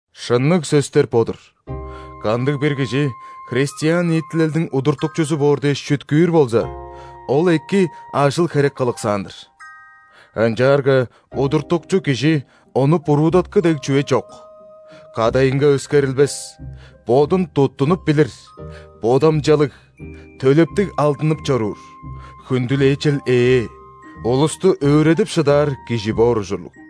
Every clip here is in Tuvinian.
Шынныг сөстер бо-дур: кандыг-бир кижи христиан ниитилелдиң удуртукчузу боор дээш чүткүүр болза, ол эки ажыл-херек кылыксаан-дыр. Ынчаарга удуртукчу кижи ону буруудаткы дег чүве чок, кадайынга өскерилбес, бодун туттунуп билир, бодамчалыг, төлептиг алдынып чоруур, хүндүлээчел ээ, улусту өөредип шыдаар кижи боор ужурлуг.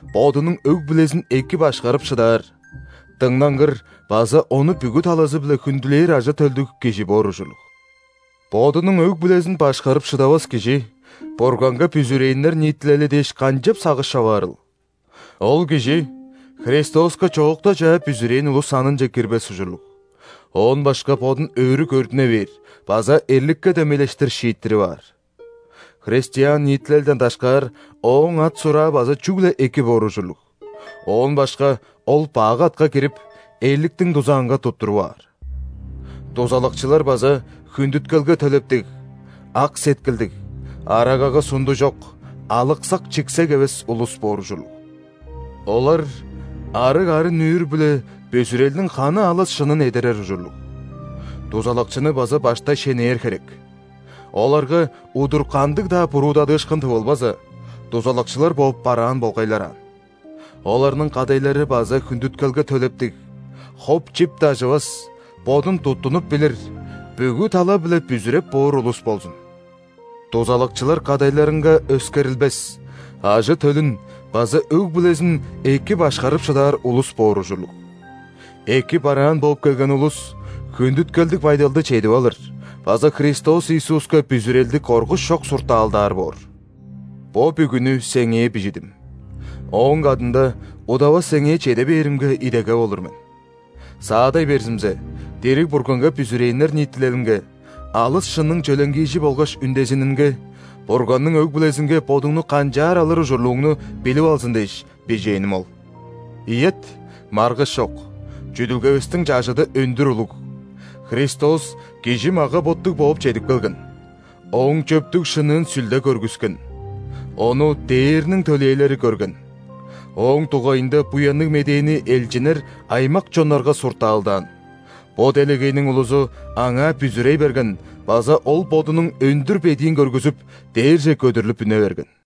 бодунуң өг-бүлезин эки башкарып шыдаар, дыңнангыр база ону бүгү талазы-биле хүндүлээр ажы-төлдүг кижи боор ужурлуг. (Бодунуң өг-бүлезин башкарып шыдавас кижи Бурганга бүзүрээннер ниитилели дээш канчап сагыш човаарыл?) Ол кижи Христоска чоокта чаа бүзүрээн улус санынче кирбес ужурлуг, оон башка бодун өрү көрдүне бээр база эрликке дөмейлештир шииттирип аар. Христиан ниитилелден дашкаар ооң ат-сураа база чүгле эки боор ужурлуг, оон башка ол бак атка кирип, эрликтиң дузаанга туттуруп аар. Дузалакчылар база хүндүткелге төлептиг, ак сеткилдиг, арагага сунду чок, алыксак-чиксек эвес улус боор ужурлуг. Олар арыг арын-нүүр-биле бүзүрелдиң ханы алыс шынын эдерер ужурлуг. Дузалакчыны база баштай шенээр херек. Оларга удур кандыг-даа буруудадыышкын тывылбаза, дузалакчылар бооп бараан болгайлар аан. Оларның кадайлары база хүндүткелге төлептиг, хоп-чип дажывас, бодун туттунуп билир, бүгү тала-биле бүзүреп боор улус болзун. Дузалакчылар кадайларынга өскерилбесR, ажы-төлүн база өг-бүлезин эки башкарып шыдаар улус боор ужурлуг. Эки бараан бооп келген улус хүндүткелдиг байдалды чедип алыр база Христос Иисуска бүзүрелди коргуш чок суртаалдаар боор. Бо бүгүнү сеңээ бижидим, ооң кадында удавас сеңээ чеде бээримге идегеп олур мен. Саадай берзимзе, дириг Бурганга бүзүрээннер ниитилелинге – алыс шынның чөленгиижи болгаш үндезининге, Бурганның өг-бүлезинге бодуңну канчаар алыр ужурлууңну билип алзын дээш, бижээним ол. Ийет, маргыш чок, чүдүлгевистиң чажыды өндүр улуг:Христос кижи мага-боттуг бооп чедип келген,Ооң чөптүг-шынныын Сүлде көргүскен,Ону ·дээрниң төлээлери көрген,Ооң дугайында Буянныг Медээни элчиннер аймак-чоннарга суртаалдаан,бо делегейниң улузу Аңаа бүзүрей берген базаОл Бодунуң өндүр бедиин көргүзүп, дээрже көдүрлүп үне берген.